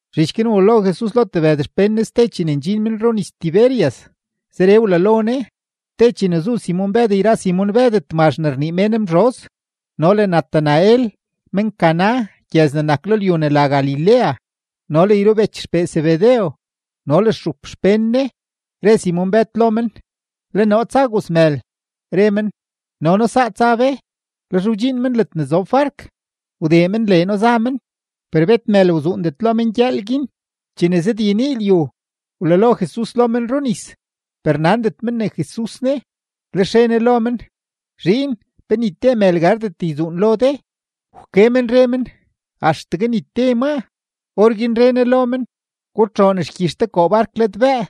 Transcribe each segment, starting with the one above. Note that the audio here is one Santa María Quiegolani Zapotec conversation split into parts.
Zhich guin wlalo Jesus lo tebëd xpén Ne ste chene ndxin men runis-Tiberias. Zeree wlalo Ne: Te chene zu Simon-Bëd yra Simon-Bëd Tmazh ne rnii mén Mzhoz, no le Natanael men-Caná gyëz ne nak lo lyu ne la Galilea, no le yrubech xpee Zebedew, no le stxup xpén Ne, re Simon-Bëd lo men: ―Le noo tsa gozmël. Re men: ―No noo saa tsa be. Lex wdxiin men ledne zob bark, wdee men leeno za men, per bet mël wzuundet lo men gyëël guin. Chene zëdyenii lyu, wlalo Jesus lo men runis, per nandet men ne Jesus ne. Lex re Ne lo men: ―Zhiin, ¿pe ni te mël gardet yzuun lo de? Wke men re men: ―Axtegue ni te maa. Orguin re Ne lo men: ―Gutxoon xgyix de koo bark ladbëë,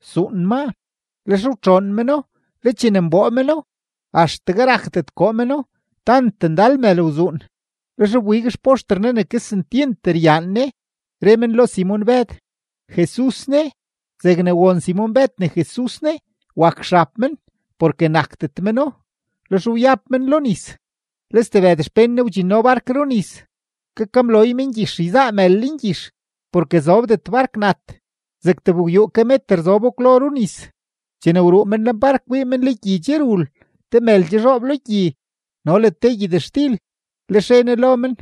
suun maa. Lex wtxoon meno, le chene nboo meno, axtegue rakdet koo meno tant ndal mël wzuun. Lex wbig xpoxter Ne ne kesentyent ryaan Ne, re men lo Simon-Bëd: ―¡Jesus ne! Zegne won Simon-Bëd ne Jesus ne, wak xab men, porke nakdet meno, lex wyab men lo nis. Le stebëd xpén Ne wdxinno bark runis, kakamloy men gyix yzaa mël lengyix, porke zobdet bark nat, zeg tebgwyuu ke meter zobo kwlo runis. Chene wruu men lenbark, wii men le gyi che rul, te mël che zhoob lo gyi no le gyëtxtil. Lex re Ne lo men: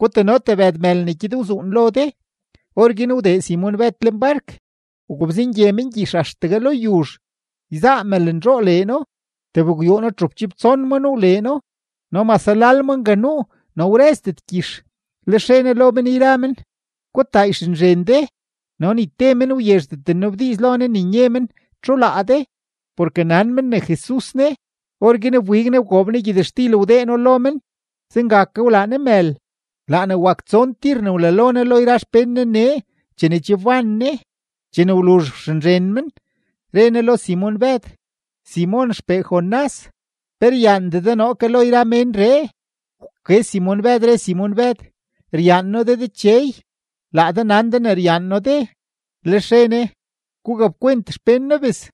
―Gutano tebëd mël ne gyed wzuun lo de. Orguin wdee Simon-Bëd lenbark, wgobzengye men gyix axtegue lo yuzh, yzaa mëlnzhoo leeno, tebgwyuuno-txupchibtson ma nuu leeno; no mase lal ma nga nuu, no wrëzdet gyix. Lex re Ne lo men yra men: ―Gutaa yxenzhen de. No ni te men wyezhdet nnabdiiz lo Ne ne nye men: “¿Txu laa de?”, porke nan men ne Jesus ne. Orguin wbig Ne, wgoob Ne gyëtxtil wdee No lo men; zenga ke wlaa Ne mël. Laa ne wak tson tir ne wlalo Ne lo yra xpén Ne nee chene che wban Ne. Chene wluzh wxenzhen men, re Jesus lo Simon-Bëd: ―Simon xpee Jonás, ¿pe ryaandee de noo ke lo yra menree? Wke Simon-Bëd, re Simon-Bëd: ―Ryaan noo de Dechey. Laa de nan de ne ryaan noo de. Lex re Ne: ―Gugapkwent xpén noo bes.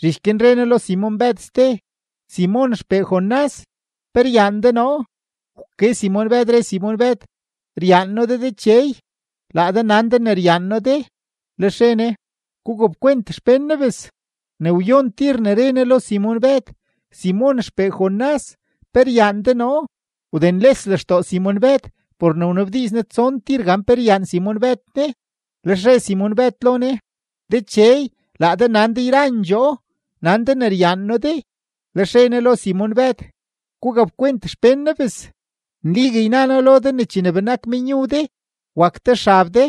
Zhich guin re Ne lo Simon-Bëd ste: ―Simon xpee Jonás, ¿pe ryaan de noo? Wke Simon-Bëd, re Simon-Bëd: ―Ryaan noo de Dechey. Laa de nan de ne ryaan noo de. Lex re Ne: ―Gugapkwent xpén noo bes. Ne wyon tir ne re Ne lo Simon-Bëd: ―Simon xpee Jonás, ¿pe ryaan de noo? Wdenles lextoo Simon-Bëd por ne wnabdiiz Ne tson tir gan pe ryaan Simon-Bëd Ne. Lex re Simon-Bëd lo Ne: ―Dechey, laa de nan de yrandxoo; nan de ne ryaan noo de. Lex re Ne lo Simon-Bëd: ―Gugapkwent xpén noo bes. Nligue yna noo lo de ne chene benak menyu de, wak de xab de,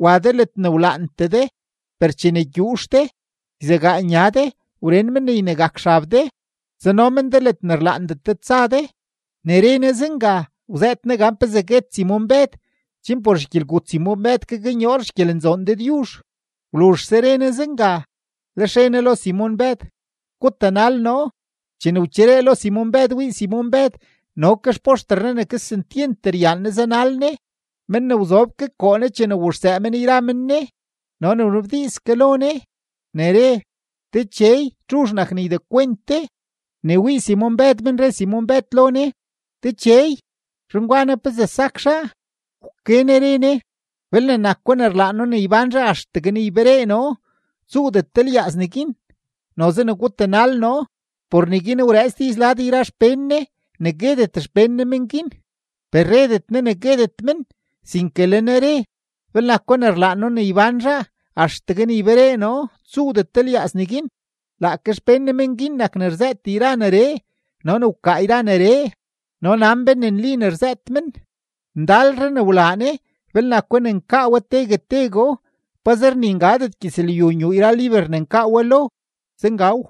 wa de ledne wlaantee de, per chene gyuux de, yzegaa nya de, wren men ne ynegak xab de, tsano men de ledne rlaandet de tsa de. Ne re Ne zenga, wzëët Ne gan pezee guet Simon-Bëd chen por xgyelgut Simon-Bëd gaknyoor xgyelenzoon Dëdyuzh. Wluzhse re Ne zenga, lex re Ne lo Simon-Bëd: ―¡Gutanal noo! Chene wcheree lo Simon-Bëd, wii Simon-Bëd no ke xpoxter Jesus ne kesentyent ryaan Ne zanal Ne, men ne wzob ke koo Ne chene wuxsëë men yra men Ne, no ne wnabdiiz ke lo Ne, ne re: “Dechey, ¿txuzh nak ne ydekwent de?” Ne wii Simon-Bëd men, re Simon-Bëd lo Ne: ―Dechey, zhan gwa naa, ¿pezee sak zhaa? Wke Ne re Ne: ―Belne nako ne rlaan noo ne ybán zhaa axtegue ne yberee noo, tsuudet de lyaaz neguin. Noze ne gutanal noo. Por neguin wrëëts diiz lad yra xpén Ne ne guetet xpén Ne men guin. Per redet Ne ne guetet men, sinke le Ne re: “Belne nako ne rlaan noo ne ybán zhaa axtegue ne yberee noo, tsuudet de lyaaz neguin.” Laake xpén Ne men guin nak ne rzëët yra neree no ne wkaa yra neree. No nan be ne nli ne rzëët men. Ndalre ne wlaa Ne belne nako ne nkaa we tegue tegoo, pazer ni ngadet gyëzlyu nyuu yra liber ne nkaa we lo. Zengaw.